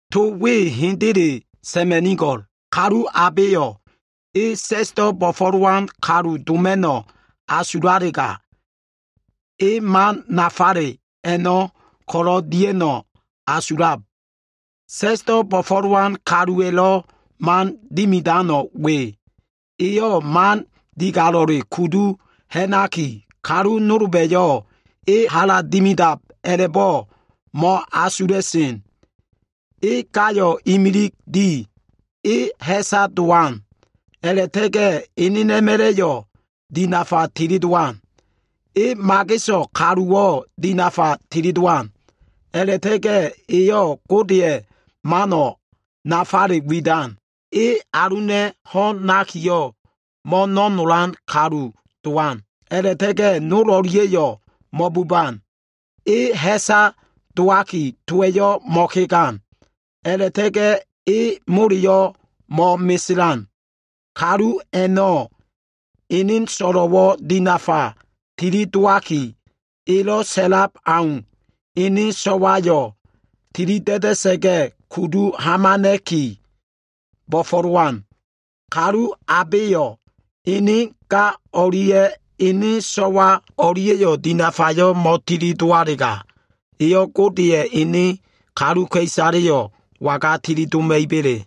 To we hendele sa꞉ma꞉nigo꞉l. Kalu abeyo꞉ e sa꞉sdo꞉ bo꞉fo꞉lowan kalu doma꞉no꞉ asulalega, e nanog nafale a꞉no꞉ ko꞉lo꞉ dia꞉no꞉ asulab. Sa꞉sdo꞉ bo꞉fo꞉lowan kaluwa꞉lo꞉ man dimidano꞉ we. Eyo꞉ mano꞉ digalo꞉le kudu ha꞉naki, kalu nolba꞉yo꞉ e hala dimidab a꞉la꞉bo꞉ mo꞉asula꞉sen. E gayo꞉ imilig di. E ha꞉sa dowan. A꞉la꞉ta꞉ga꞉ enena꞉ma꞉la꞉yo꞉ dinafa tilidowan. E mageso꞉ kaluwo꞉ dinafa tilidowan. A꞉la꞉ta꞉ga꞉ eyo꞉ Godeya꞉ mano꞉ nafale widan. E aluna꞉ ho꞉n nakiyo꞉, mo꞉no꞉nolan kalu dowan. A꞉la꞉ta꞉ga꞉ nol o꞉lia꞉yo꞉ mo꞉buban. E ha꞉sa dowaki, towa꞉yo꞉ mo꞉kegan. A꞉la꞉ta꞉ga꞉ e moleyo꞉ mo꞉meselan. Kalu a꞉no꞉ ene so꞉lo꞉wo꞉ dinafa tilidowaki, elo꞉ sa꞉lab aumbo꞉ ene so꞉wayo꞉ tilida꞉da꞉sa꞉ga꞉ kudu hamana꞉ki, bo꞉fo꞉lowan. Kalu abeyo꞉ ene ga o꞉lia꞉ ene so꞉wa o꞉lia꞉yo꞉ dinafayo꞉ mo꞉tilidowalega, eyo꞉ Godeya꞉ ene kaluka꞉isaleyo꞉ waga tilidoma꞉iba꞉le?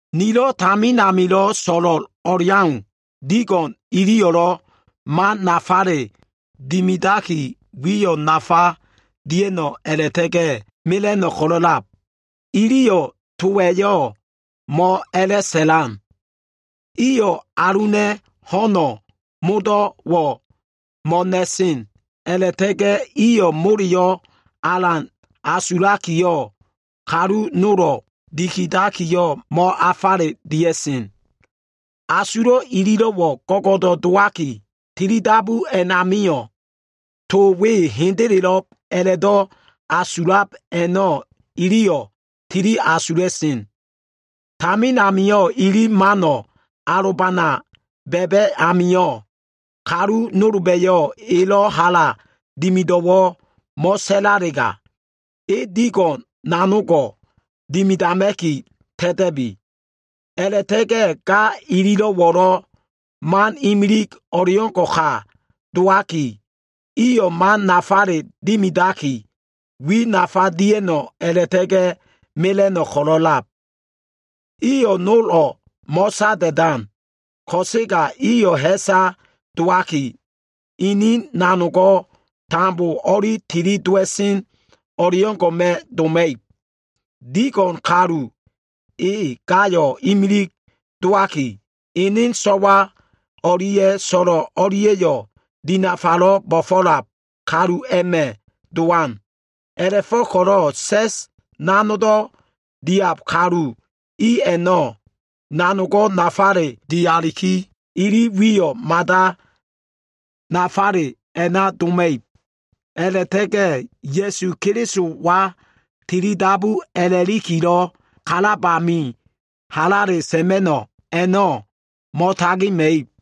Nilo꞉ tamin amilo꞉ so꞉lo꞉l o꞉leau, digo꞉n iyo꞉lo꞉ man nafale dimidaki, wiyo꞉ nafa dia꞉no꞉ a꞉la꞉ta꞉ga꞉ mela꞉no꞉ ko꞉lo꞉lab. Iliyo꞉ towa꞉yo꞉ mo꞉a꞉la꞉sa꞉lan. Iyo꞉ aluna꞉ ho꞉no꞉ modo꞉wo꞉ mo꞉na꞉sen a꞉la꞉ta꞉ga꞉ iyo꞉ moleyo꞉ alan asulakiyo꞉ kalu nolo꞉ dikidakiyo꞉ mo꞉afale dia꞉sen. Asulo꞉ ililo꞉wo꞉ go꞉go꞉do꞉ dowaki, tilidabu a꞉namio꞉ to we hendelelo꞉b a꞉la꞉do꞉ asulab a꞉no꞉ iliyo꞉ tili asula꞉sen. Tamin amio꞉ ili mano꞉ alobana ba꞉ba꞉ amio꞉, kalu nolba꞉yo꞉ elo꞉ hala dimido꞉wo꞉ mo꞉sa꞉lalega, e digo꞉n nanogo꞉ dimidama꞉ki ta꞉ta꞉bi. A꞉la꞉ta꞉ga꞉ ga ililo꞉wo꞉lo꞉, mano꞉ imilig o꞉leo꞉ngo꞉ka dowaki, iyo꞉ man nafale dimidaki, wiyo꞉ nafa dia꞉no꞉ a꞉la꞉ta꞉ga꞉ mela꞉no꞉ ko꞉lo꞉lab. Iyo꞉ nolo꞉ mo꞉sada꞉dan. Ko꞉sega iyo꞉ ha꞉sa dowaki, ini nanogo꞉ tambo o꞉li tilidowa꞉sen o꞉leo꞉ngo꞉ma꞉ doma꞉ib. Digo꞉n kalu e gayo꞉ imilig dowaki, ene so꞉wa o꞉lia꞉ so꞉lo꞉ o꞉lia꞉yo꞉ dinafalo꞉ bo꞉fo꞉lab kalu a꞉ma꞉ dowan. A꞉la꞉fo꞉ko꞉lo꞉ sa꞉s nanogdo꞉ diab kalu i a꞉no꞉, nanogo꞉ nafale dialiki, ili wiyo꞉ mada nafaleyo꞉ a꞉na doma꞉ib. A꞉la꞉ta꞉ga꞉ Ya꞉su Kelisowa tilidabu a꞉la꞉likilo꞉ kalab amio꞉ halale sa꞉ma꞉no꞉ a꞉no꞉ mo꞉tagima꞉ib.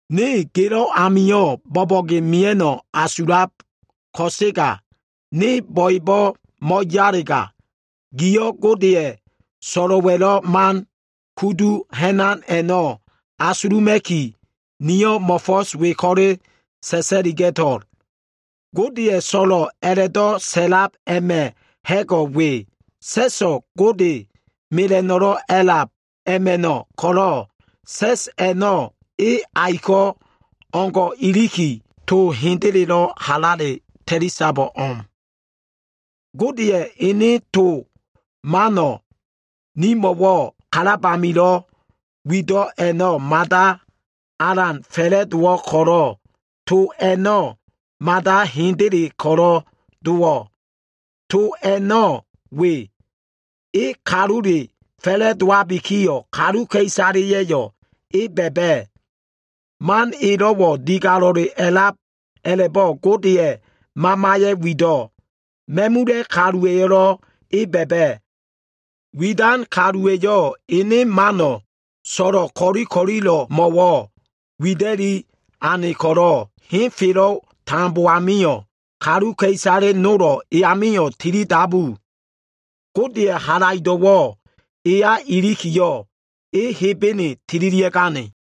Ne gelo꞉ amio꞉ bo꞉bo꞉ge mia꞉no꞉ asulab ko꞉sega, ne bo꞉ebo꞉ mo꞉yalega, giyo꞉ Godeya꞉ so꞉lo꞉wa꞉lo꞉ man kudu ha꞉nan a꞉no꞉ asuluma꞉ki, niyo꞉ mo꞉fo꞉s we ko꞉le sa꞉sa꞉liga꞉to꞉l. Godeya꞉ so꞉lo꞉ a꞉la꞉do꞉ sa꞉lab a꞉ma꞉ ha꞉go꞉ we. Sa꞉so꞉ Gode mela꞉no꞉lo꞉ a꞉lab a꞉ma꞉no꞉ ko꞉lo꞉, sa꞉s a꞉no꞉ e aiko꞉ o꞉ngo꞉ iliki, to hendelelo꞉ halale ta꞉lisabo꞉ o꞉m. Godeya꞉ ene to mano꞉ nimo꞉lo꞉ kalab amilo꞉ wido꞉ a꞉no꞉ mada alan fa꞉la꞉dowo꞉ ko꞉lo꞉, to a꞉no꞉ mada hendeleyo꞉ ko꞉lo꞉ dowo꞉. To a꞉no꞉ we. E kalule fa꞉la꞉dowabikiyo꞉, kaluka꞉isaleya꞉yo꞉ E ba꞉ba꞉. Man elo꞉wo꞉ digalo꞉le a꞉lab a꞉la꞉bo꞉ Godeya꞉ Mamaya꞉ wido꞉. Ma꞉mula꞉ kaluwa꞉yo꞉lo꞉ E ba꞉ba꞉. Widan kaluwa꞉yo꞉ Ene mano꞉ so꞉lo꞉ ko꞉li ko꞉lilo꞉mo꞉wo꞉ wida꞉li ane ko꞉lo꞉, henfelo꞉ we tambo amio꞉ kaluka꞉isale nolo꞉ E amio꞉ tilidabu. Godeya꞉ halaido꞉wo꞉ Eya ilikiyo꞉, E Hebene tililia꞉gane.